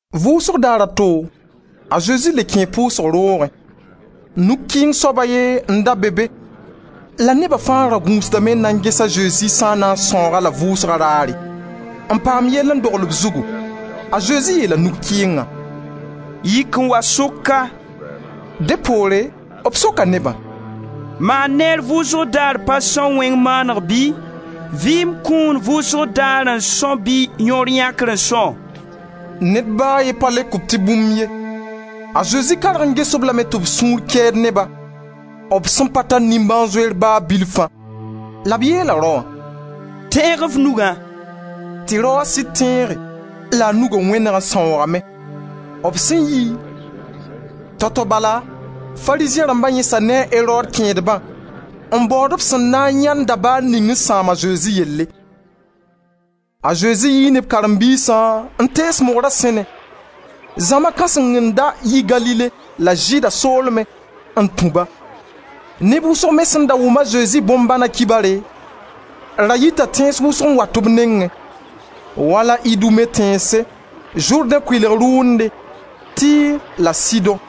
Vʋʋsg daar a to, a Zezi le kẽe pʋʋsg roogẽ. Nug-kɩɩng soab a ye n da be be la neba fãa ra gũusdame n na n ges a Zezi sã n na n sãoog-a-la vʋʋsga raare, n paam yell n dogl b zugu. A Zezi yeela nug-kɩɩngã: «Yik n wa sʋk ka.» Dẽ poore b soka nebã: «Maan neer vʋʋsg daar pa são wẽng maaneg bɩ? Vɩɩm kũun vʋʋsg daar n são bɩ yõor yãkre n são?» Ned ba a ye pa leok-b tɩ bũmb ye. A Zezi karg n ges-b lame tɩ b sũur kɛɛd ne-ba, b sẽn pa tar nimbãan-zoeer ba bilfã la b yeela raoã: «Tẽeg f nugã!» Tɩ raoã sɩd tẽege la a nuga wẽneg n sãoogame. B sẽn yi, tao-tao bala, Farizẽ rãmba yẽsa ne a Erod kẽedbã n baood b sẽn na n yãend dabaar ninga n sãam a Zezi yelle. A Zezi yii ne b karen-biisã n tees mogra sẽne; zãma kãseng n da yi Galile la Zɩɩda soolmẽ n tũ-ba. Neb wʋsg me sẽn da wʋm a Zezi bõn-bãna kibare da yita tẽns wʋsg n wat b nengẽ, wala Idume tẽnse, Zʋrdẽ kʋɩlg rʋʋnde, Tir la Sidõ.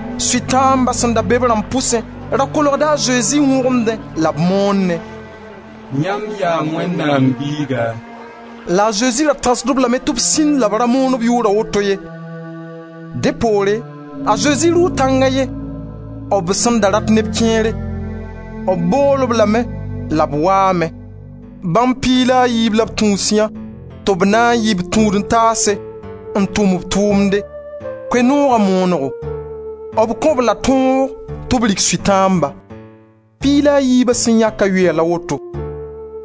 Sʋtãamba sẽn da be b rãmb pʋsẽ da kolgda a Zezi n wõgemdẽ la b moonẽ: «Yãmb yaa Wẽnnaam Biiga!» La a Zezi ra tãsd-b lame tɩ b sĩndi la b ra moon b yʋʋra woto ye. Dẽ poore a Zezi dʋʋ tãng a ye. B sẽn da rat neb kẽere, b bool-b lame la b waame. Bãmb piig la a yiib la b tũusyã tɩ b na yɩ b Tũud-n-taase n tʋm b tʋʋmde: Koe-nooga moonego. B kõ-b-la tõog tɩ b rig Sʋtãamba. Piig la a yiiba sẽn yãkã yʋy la woto: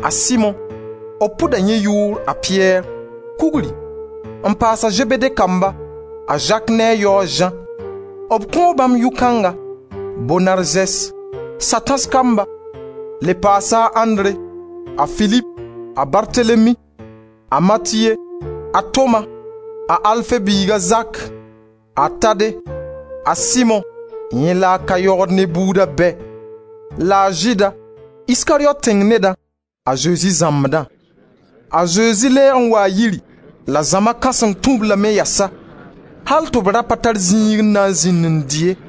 a Simo, b pʋda yẽ yʋʋr a Piyɛr, Kugri, n paas a Zebede kamba: a Zak ne a yao a Zã. B kõo bãmb yʋ-kãnga: Bonarzes (sa-tãs kamba) Le paasa a Andre, a Filip, a Bartelemi, a Matiye, a Toma, a Alfe biig a Zak, a Tade, a Simo, yẽ la a ka yogd ne buuda bɛ, la a Zɩɩda, Iskariyot tẽng neda, a Zezi zãmbdã. A Zezi lɛɛg n waa yiri la zãma kãseng tũ-b lame yɛsa, al tɩ b ra pa tar zĩig n na n zĩnd n dɩ ye.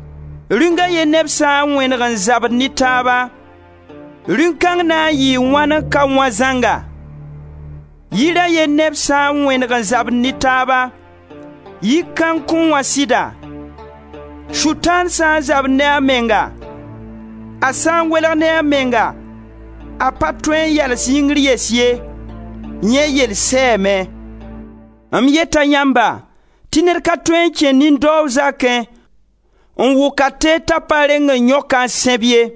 Rĩung a ye neb sã n wẽneg n zabd ne taaba, rĩung kãng na n yɩɩ wãn n ka wã zãnga? Yir a ye neb sã n wẽneg n zabd ne taaba, yi kãng kõn wã sɩda? Sʋtãan sã n zabd ne a menga, a sã n welg ne a menga, a pa tõe n yals yĩngr yɛs ye. Yẽ yell sɛɛme. M yeta yãmba tɩ ned ka tõe n kẽ nin-daoog zakẽ n wʋk a teed t'a pa reng n yõk-a n sẽb ye.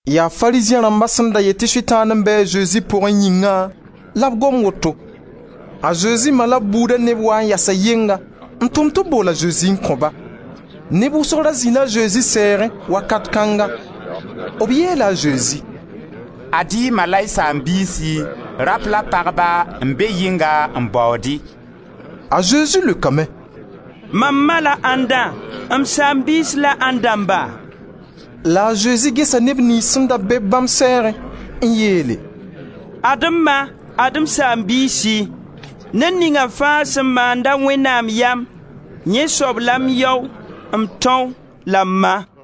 Yaa Farizẽ rãmba sẽn da yet tɩ Sʋtãan n be a Zezi pʋgẽ yĩngã la b gom woto. A Zezi ma la b buuda neb waa n yaasa yɩnga n tʋm tɩ b bool a Zezi n kõ-ba. Neb wʋsg da zĩ-la a Zezi sɛɛgẽ, wakat kãnga. B yeela a Zezi: «Ad-y y ma la y saam-biisi, rap la pagba n be yɩnga n baood-y.» A Zezi leokame: «Mam ma la ãndã, m saam-biis la ãnd dãmba?» La a Zezi gesa neb niyns sẽn da be-b bãmb sɛɛgẽ n yeele: «Ad-m ma, ad-m saam-biisi. Ned ninga fãa sẽn maand-a Wẽnnaam yam, yẽ soab la m yao, m tão la m ma.»